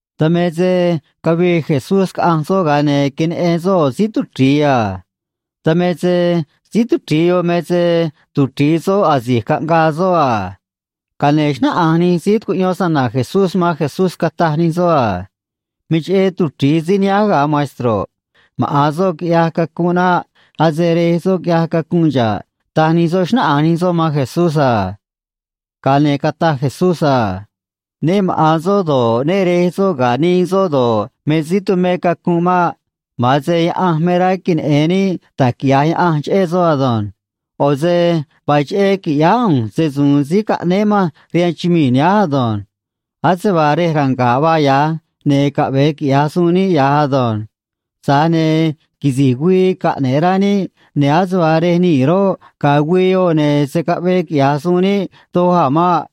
Dan me se cavii Jesucristó caꞌanj soꞌ, ga̱a ne̱ queneꞌen soꞌ ꞌo̱ síí tuchri̱i a. Dan me se síí tuchri̱i yoꞌ me se tuchri̱i soꞌ asi̱j caꞌngaa soꞌ a. Ga̱a ne̱ xnáꞌanj nij síí tucuꞌyón se‑na̱na̱ Jesucristó man Jesucristó, cataj nij soꞌ: ―Me cheꞌé tuchri̱i síí nihánj, ga̱ man maestroꞌ. Maꞌa̱n soꞌ quiꞌyaj cacunꞌ naꞌ. Ase rej soꞌ quiꞌyaj cacunꞌ xa̱ꞌ ―taj nij soꞌ, xnáꞌanj nij soꞌ man Jesucristó a. Ga̱a ne̱ cataj Jesucristó: ―Nuveé maꞌa̱n soꞌ, nuveé re̱j soꞌ ga̱ nii soꞌ do̱ꞌ, me síí tumé cacunꞌ maꞌ. Ma̱a̱n se Diose̱ me rá queneꞌe̱n níꞌ da̱j quiꞌya̱j Diose̱ cheꞌé soꞌ ado̱nj. ꞌO̱ se no̱ xcúún níꞌ quiꞌya̱j suun níꞌ se‑su̱u̱n síí caꞌnéé manj rihaan chumii̱ nihánj ado̱nj. Ase vaa rej ranga̱ꞌ vaa yoꞌ ya̱j, ne̱ caꞌve̱e quiꞌya̱j suun níꞌ ya̱j ei. Tza̱j ne̱ quisi̱j güii caꞌne̱ꞌ rá níꞌ, ne̱ ase vaa rej nii̱ roꞌ, ga̱a̱ güii yoꞌ, ne̱ se̱ caꞌvee quiꞌya̱j suun níꞌ doj a̱ maꞌ.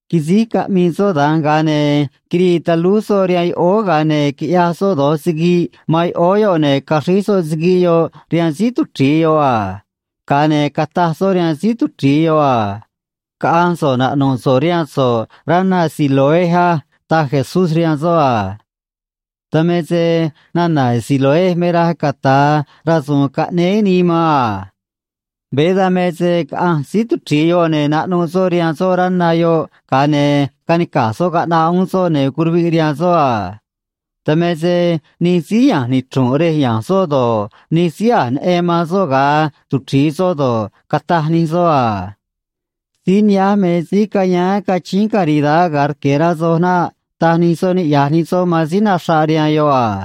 Quisíj caꞌmii soꞌ da̱nj, ga̱a ne̱ quirii talúj soꞌ rihaan yoꞌóó, ga̱a ne̱ quiꞌyaj soꞌ do̱j siguiꞌ man yoꞌóó yoꞌ, ne̱ caxríj soꞌ siguiꞌ yoꞌ rihaan síí tuchri̱i yoꞌ a. Ga̱a ne̱ cataj soꞌ rihaan síí tuchri̱i yoꞌ a: ―Caꞌa̱nj so̱ꞌ naꞌnu̱ꞌ so̱ꞌ rihaan so̱ꞌ rá na Siloé á ―taj Jesucristó rihaan soꞌ a. Dan me se cuya̱a̱n vaa nana̱ “Siloé” yoꞌ ga̱ nana̱ “rasu̱u̱n caꞌnéé nii man” a. Veé dan me se caꞌanj síí tuchri̱i yoꞌ, ne̱ naꞌnuꞌ soꞌ rihaan soꞌ rá na yoꞌ, ga̱a ne̱ canica̱j soꞌ caꞌnaꞌ uún soꞌ, ne̱ curuviꞌ rihaan soꞌ a. Dan me se nij síí ya̱nj nichru̱nꞌ yan ya̱nj soꞌ do̱ꞌ, nij síí a̱j neꞌen man soꞌ ga̱a tuchri̱i soꞌ do̱ꞌ, cataj nij soꞌ: ―Ne̱ síí nihánj me síí cane cachíín caridad ga̱a rque̱, rá soj naꞌ ―taj nij soꞌ niꞌya̱j nij soꞌ man síí naxraꞌ rihaan yoꞌ a.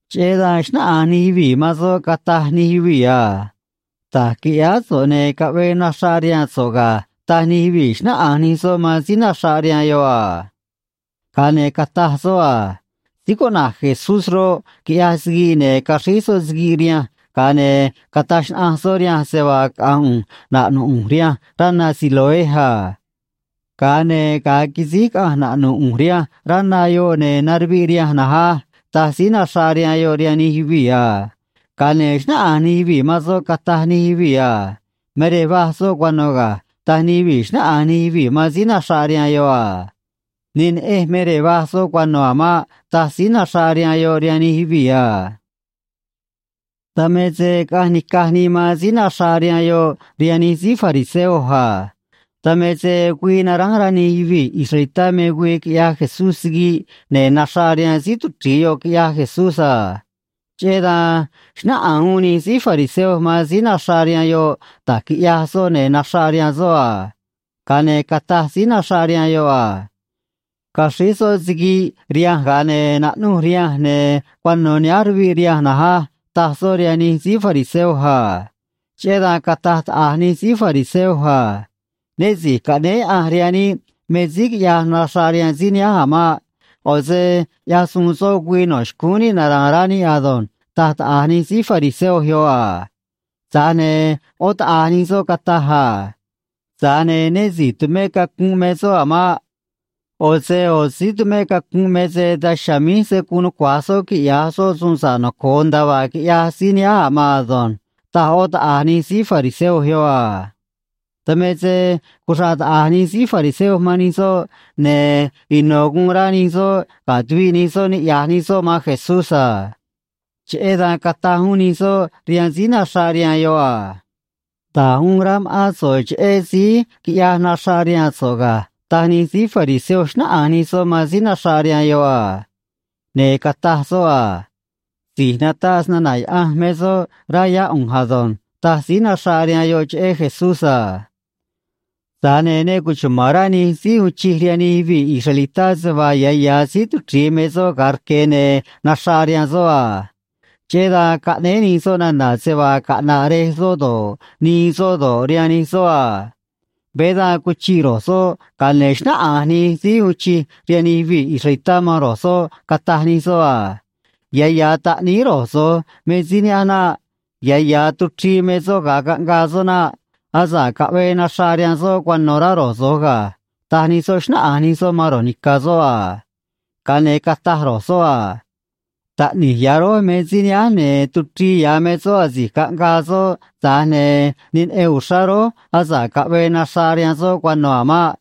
Cheꞌé dan xnáꞌanj nij yuvii̱ man soꞌ, cataj nij yuvii̱: ―Da̱j quiꞌyáá so̱ꞌ, ne̱ caꞌvee naxraꞌ rihaan so̱ꞌ ga̱ ―taj nij yuvii̱, xnáꞌanj nij soꞌ man síí tuchri̱i yoꞌ a. Ga̱a ne̱ cataj soꞌ: ―Síí cuꞌna̱j Jesucristó roꞌ, quiꞌyaj siguiꞌ, ne̱ caxríj soꞌ siguiꞌ rihanj, ga̱a ne̱ cataj xnaꞌanj soꞌ rihanj se vaa caꞌa̱nj ꞌu̱nj naꞌnu̱ꞌ ꞌu̱nj rihanj rá na Siloé a. Ga̱a ne̱ ga̱a quisíj caꞌanj naꞌnu̱ꞌ ꞌu̱nj rihanj rá na yoꞌ, ne̱ naruviꞌ rihanj na̱nj á ―taj síí naxraꞌ rihaan yoꞌ rihaan nij yuvii̱ a. Ga̱a ne̱ xnáꞌanj nij yuvii̱ man soꞌ, cataj nij yuvii̱: ―Me rej vaj soꞌ cuano̱ ga̱ ―taj nij yuvii̱, xnáꞌanj nij yuvii̱ man síí tuchri̱i yoꞌ a. ―Ne neꞌenj me rej vaj soꞌ cuano̱ a̱ maꞌ ―taj síí tuchri̱i yoꞌ rihaan nij yuvii̱ a. Dan me se caꞌanj nica̱j nii man síí naxraꞌ rihaan yoꞌ rihaan nij síí fariseo a. Dan me se güii naránj rá nij yuvii̱ israelitá me güii quiꞌyaj Jesucristó siguiꞌ ne̱ naxraꞌ rihaan síí tuchri̱i yoꞌ quiꞌyaj Jesucristó a. Cheꞌé dan xnáꞌanj uún nij síí fariseo man síí naxraꞌ rihaan yoꞌ da̱j quiꞌyaj soꞌ ne̱ naxraꞌ rihaan soꞌ a. Ga̱a ne̱ cataj síí naxraꞌ rihaan yoꞌ: ―Quiꞌyaj soꞌ siguiꞌ, ne̱ caxríj soꞌ rihanj, ga̱a ne̱ naꞌnuj rihanj, ne̱ cuano̱ nihánj ruviꞌ rihanj na̱nj á ―taj soꞌ rihaan nij síí fariseo a. Cheꞌé dan cataj taꞌa̱j nij síí fariseo: ―Nuveé si̱j caꞌnéé Diose̱ rihaan níꞌ me síí quiꞌyaj naxraꞌ rihaan síí nihánj a̱ maꞌ. ꞌO̱ se ꞌyaj suun soꞌ güii no̱ xcúún níꞌ nara̱a̱n rá níꞌ ado̱nj ―taj taꞌa̱j nij síí fariseo yoꞌ a. Tza̱j ne̱ yoꞌó taꞌa̱j nij soꞌ cataj: ―Tza̱j ne̱ nuveé si̱j tumé cacunꞌ me soꞌ a̱ maꞌ. ꞌO̱ se nij síí tumé cacunꞌ me se daj chiha̱a̱ míj se̱ guun nucua̱j nij síí tumé cacunꞌ quiꞌya̱j nij soꞌ suun sa̱ꞌ noco̱o nda̱a vaa quiꞌyaj síí quiꞌyaj naxraꞌ rihaan síí nihánj a̱ ado̱nj ―taj yoꞌó taꞌa̱j nij síí fariseo yoꞌ a. Dan me se cuxraꞌ taꞌa̱j nij síí fariseo man nij soꞌ, ne̱ ino̱ guun rá nij soꞌ ga̱ tuviꞌ nij soꞌ niꞌya̱j nij soꞌ man Jesucristó a. Cheꞌé dan cataj uún nij soꞌ rihaan síí naxraꞌ rihaan yoꞌ a: ―Da̱j uun rá ma̱ꞌán so̱ꞌ cheꞌé síí quiꞌyaj naxraꞌ rihaan so̱ꞌ ga̱ ―taj nij síí fariseo, xnáꞌanj nij soꞌ man síí naxraꞌ rihaan yoꞌ a. Ne̱ cataj soꞌ: ―Si̱j nataꞌ se‑na̱na̱ Diose̱ me soꞌ, rá yá ꞌu̱nj ado̱nj ―taj síí naxraꞌ rihaan yoꞌ cheꞌé Jesucristó a. Tza̱j ne̱ ne cuchuma̱n rá nij síí uun chij rihaan nij yuvii̱ israelitá se vaa ya̱ ya̱ tuchrii me soꞌ ga̱a rque̱ ne̱ naxraꞌ rihaan soꞌ a. Cheꞌé dan caꞌnéé nij soꞌ nana̱ se vaa caꞌna̱ꞌ rej soꞌ do̱ꞌ, nii soꞌ do̱ꞌ, ga̱ síí naxraꞌ rihaan yoꞌ rihaan nij soꞌ a. Veé dan cuchiꞌ ro̱j soꞌ, ga̱a ne̱ xnáꞌanj nij síí uun chij rihaan nij yuvii̱ israelitá man ro̱j soꞌ, cataj nij soꞌ: ―Ya̱ ya̱ taꞌníí ro̱j so̱j me síí nihánj naꞌ. Ya̱ ya̱ tuchrii me soꞌ ga̱a caꞌngaa soꞌ naꞌ. Asa̱ꞌ caꞌvee naxraꞌ rihaan soꞌ cuano̱, rá ro̱j so̱j ga̱ ―taj nij soꞌ, xnáꞌanj nij soꞌ man ro̱j ni̱ca̱ soꞌ a. Ga̱a ne̱ cataj ro̱j soꞌ: ―Taꞌni̱j ya̱ rój me síí nihánj, ne̱ tuchrii ya̱ me soꞌ asi̱j caꞌngaa soꞌ, tza̱j ne̱ ne neꞌen uxrá rój asa̱ꞌ caꞌvee naxraꞌ rihaan soꞌ cuano̱ a̱ maꞌ.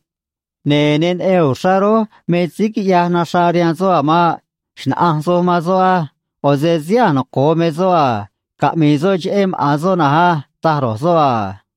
Ne̱ ne neꞌen uxrá rój me síí quiꞌyaj naxraꞌ rihaan soꞌ a̱ maꞌ. Xna̱ꞌanj soj man soꞌ á. ꞌO̱ se síí a̱j noco̱o me soꞌ, caꞌmi̱i̱ soꞌ cheꞌé maꞌa̱n soꞌ na̱nj á ―taj ro̱j soꞌ a.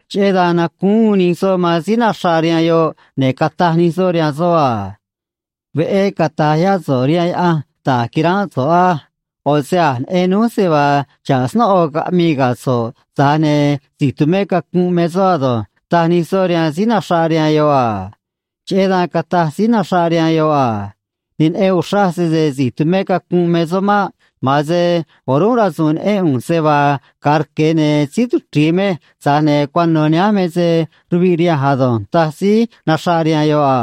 Cheꞌé dan nacúún uún nij soꞌ man síí naxraꞌ rihaan yoꞌ, ne̱ cataj nij soꞌ rihaan soꞌ a: ―Veꞌé cata̱j yá so̱ꞌ rihaan Diose̱ da̱j quiránꞌ so̱ꞌ á. ꞌO̱ se a̱j neꞌen núj se vaa xa̱ꞌ snóꞌo caꞌmii ga̱ so̱ꞌ, tza̱j ne̱ si̱j tumé cacunꞌ me soꞌ ei ―taj nij soꞌ rihaan síí naxraꞌ rihaan yoꞌ a. Cheꞌé dan cataj síí naxraꞌ rihaan yoꞌ: ―Ne neꞌen uxraj sese si̱j tumé cacunꞌ me soꞌ maꞌ. Ma̱a̱n se o̱rúnꞌ rasu̱u̱n neꞌén ꞌu̱nj se vaa ga̱a rque̱, ne̱ síí tuchri̱i mej, tza̱j ne̱ cuano̱ nihánj me se ruviꞌ rihanj ado̱nj ―taj síí naxraꞌ rihaan yoꞌ a.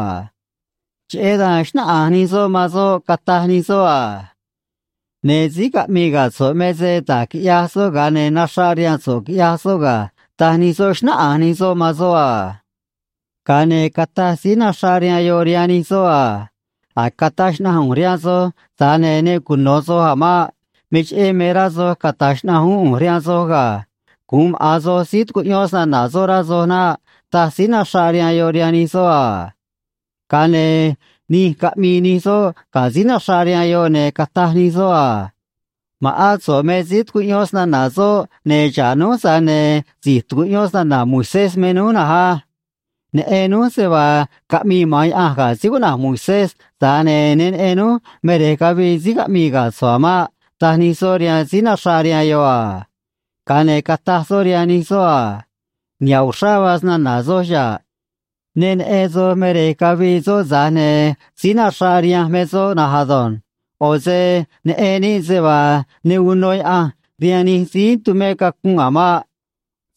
Cheꞌé dan xnáꞌanj nij soꞌ man soꞌ, cataj nij soꞌ: ―Ne̱ xa̱ꞌ síí caꞌmii ga̱ so̱ꞌ, tza̱j ne̱ da̱j quiꞌyaj soꞌ, ga̱a ne̱ naxraꞌ rihaan so̱ꞌ quiꞌyaj soꞌ ga̱ ―taj nij soꞌ, xnáꞌanj nij soꞌ man soꞌ a. Ga̱a ne̱ cataj síí naxraꞌ rihaan yoꞌ rihaan nij soꞌ a: ―A̱j cataj xnaꞌanj ꞌu̱nj rihaan soj, tza̱j ne̱ ne cuno̱ soj a̱ maꞌ. Me cheꞌé me rá soj cata̱j xnaꞌanj uún ꞌu̱nj rihaan soj ga̱. Gu̱un maꞌa̱n soj síí tucuꞌyón se‑na̱na̱ soꞌ, rá soj naꞌ ―taj síí naxraꞌ rihaan yoꞌ rihaan nij soꞌ a. Ga̱a ne̱ nij caꞌmii nij soꞌ ga̱ síí naxraꞌ rihaan yoꞌ, ne̱ cataj nij soꞌ: ―Ma̱ꞌán so̱ꞌ me síí tucuꞌyón se‑na̱na̱ soꞌ, ne̱ xa̱ꞌ núj, tza̱j ne̱ si̱j tucuꞌyón se‑na̱na̱ Moisés me núj ei. Neꞌen núj se vaa caꞌmii maꞌa̱n Diose̱ ga̱ síí cuꞌna̱j Moisés, tza̱j ne̱ ne neꞌen núj me rej cavii síí caꞌmii ga̱ so̱ꞌ a̱ maꞌ ―taj nij soꞌ rihaan síí naxraꞌ rihaan yoꞌ a. Ga̱a ne̱ cataj soꞌ rihaan nij soꞌ a: ―Niha̱ꞌ uxrá vaa se‑na̱na̱ soj chiha̱ꞌ. Ne neꞌen soj me rej cavii soꞌ, tza̱j ne̱ síí nacuchraꞌ rihanj me soꞌ na̱nj ado̱nj. ꞌO̱ se neꞌen níꞌ se vaa ne uno Diose̱ rihaan nij síí tumé cacunꞌ a̱ maꞌ.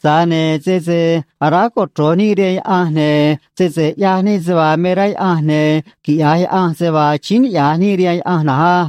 Tza̱j ne̱ sese aráj cochro̱j níꞌ rihaan Diose̱, ne̱ sese ꞌyaj níꞌ se vaa me rá Diose̱, ne̱ quiꞌya̱j Diose̱ se vaa achíín niꞌya̱j níꞌ rihaan Diose̱ na̱nj á.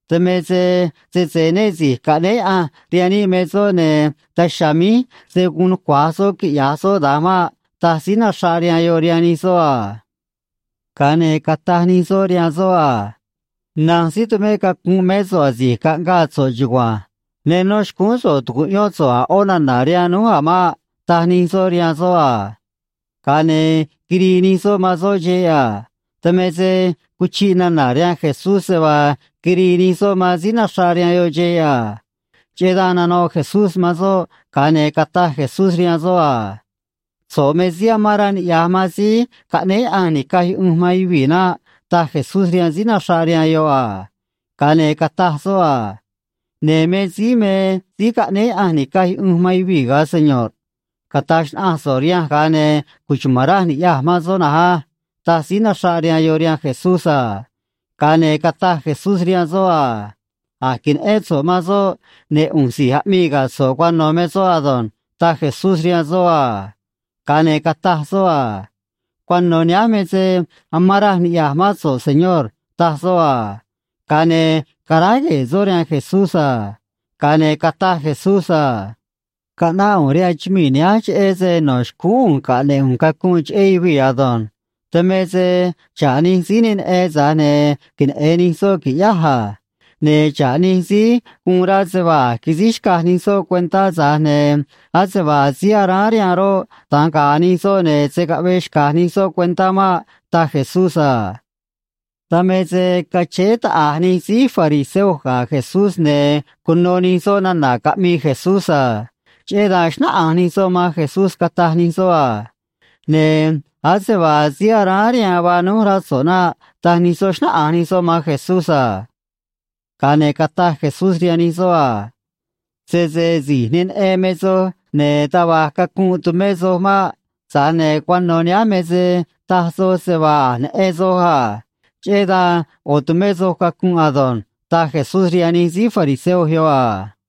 Dan me se sese nuveé si̱j caꞌnéé Diose̱ rihaan níꞌ me soꞌ, ne̱ daj chiha̱a̱ míj se̱ guun nucua̱j soꞌ quiꞌya̱j soꞌ da̱nj maꞌ ―taj síí naxraꞌ rihaan yoꞌ rihaan nij soꞌ a. Ga̱a ne̱ cataj nij soꞌ rihaan soꞌ a: ―Na̱nj síí tumé cacunꞌ mé so̱ꞌ asi̱j caꞌngaa so̱ꞌ ei. Ne nó xcúún so̱ꞌ tu̱cuꞌyón so̱ꞌ a̱ ꞌó nana̱ rihaan núj a̱ maꞌ ―taj nij soꞌ rihaan soꞌ a. Ga̱a ne̱ quirii nij soꞌ man soꞌ xeꞌ a. Dan me se cuchiꞌ nana̱ rihaan Jesucristó se vaa quirii nij soꞌ man síí naxraꞌ rihaan yoꞌ xeꞌ a. Cheꞌé dan nanoꞌ Jesucristó man soꞌ, ga̱a ne̱ cataj Jesucristó rihaan soꞌ a: ―So̱ꞌ me síí amán rá niꞌya̱j man síí caꞌnéé Diose̱ ni̱caj yuꞌunj man yuvii̱ naꞌ ―taj Jesucristó rihaan síí naxraꞌ rihaan yoꞌ a. Ga̱a ne̱ cataj soꞌ: ―Ne̱ me síí me síí caꞌnéé Diose̱ ni̱caj yuꞌunj man yuvii̱, señorꞌ. Cata̱j xnaꞌanj so̱ꞌ noj, ga̱a ne̱ cuchuma̱n raj ni̱ꞌyaj man soꞌ ei ―taj síí naxraꞌ rihaan yoꞌ rihaan Jesucristó a. Ga̱a ne̱ cataj Jesucristó rihaan soꞌ: ―A̱j queneꞌén so̱ꞌ man soꞌ, ne̱ ꞌu̱nj si̱j aꞌmii ga̱ so̱ꞌ cuano̱ me soꞌ ado̱nj ―taj Jesucristó rihaan soꞌ a. Ga̱a ne̱ cataj soꞌ: ―Cuano̱ nihánj me se chumán raj niꞌya̱j mán so̱ꞌ, Señor ―taj soꞌ a. Ga̱a ne̱ canicunꞌ ru̱j soꞌ rihaan Jesucristó a. Ga̱a ne̱ cataj Jesucristó: ―Caꞌnáꞌ ꞌu̱nj rihaan chumii̱ nihánj cheꞌé se no̱ xcúún ꞌu̱nj caꞌne̱ꞌ ꞌu̱nj cacunꞌ cheꞌé yuvii̱ ado̱nj. Dan me se xa̱ꞌ nij síí ne neꞌen, tza̱j ne̱ queneꞌe̱n nij soꞌ, qui̱ꞌyáj, ne̱ xa̱ꞌ nij síí guun rá se vaa a̱j quisíj xcaj nij soꞌ cuentá, tza̱j ne̱ ase vaa síí aráán rihaan roꞌ, da̱nj ga̱a̱ nij soꞌ se vaa se̱ caꞌvee xca̱j nij soꞌ cuentá maꞌ ―taj Jesucristó a. Dan me se cachéé taꞌa̱j nij síí fariseo ga̱ Jesucristó, ne̱ cuno nij soꞌ nana̱ caꞌmii Jesucristó a. Cheꞌé dan xnáꞌanj nij soꞌ man Jesucristó, cataj nij soꞌ: ―Ne̱ ase vaa síí aráán rihaan vaa núj, rá so̱ꞌ naꞌ ―taj nij soꞌ, xnáꞌanj nij soꞌ man Jesucristó a. Ga̱a ne̱ cataj Jesucristó rihaan nij soꞌ a: ―Sese si̱j ne neꞌen me soj, ne̱ taj va̱j cacunꞌ tumé soj maꞌ. Tza̱j ne̱ cuano̱ nihánj me se cataj soj se vaa a̱j neꞌen soj a. Cheꞌé dan yoꞌo̱ tumé soj cacunꞌ ado̱nj ―taj Jesucristó rihaan nij síí fariseo yoꞌ a.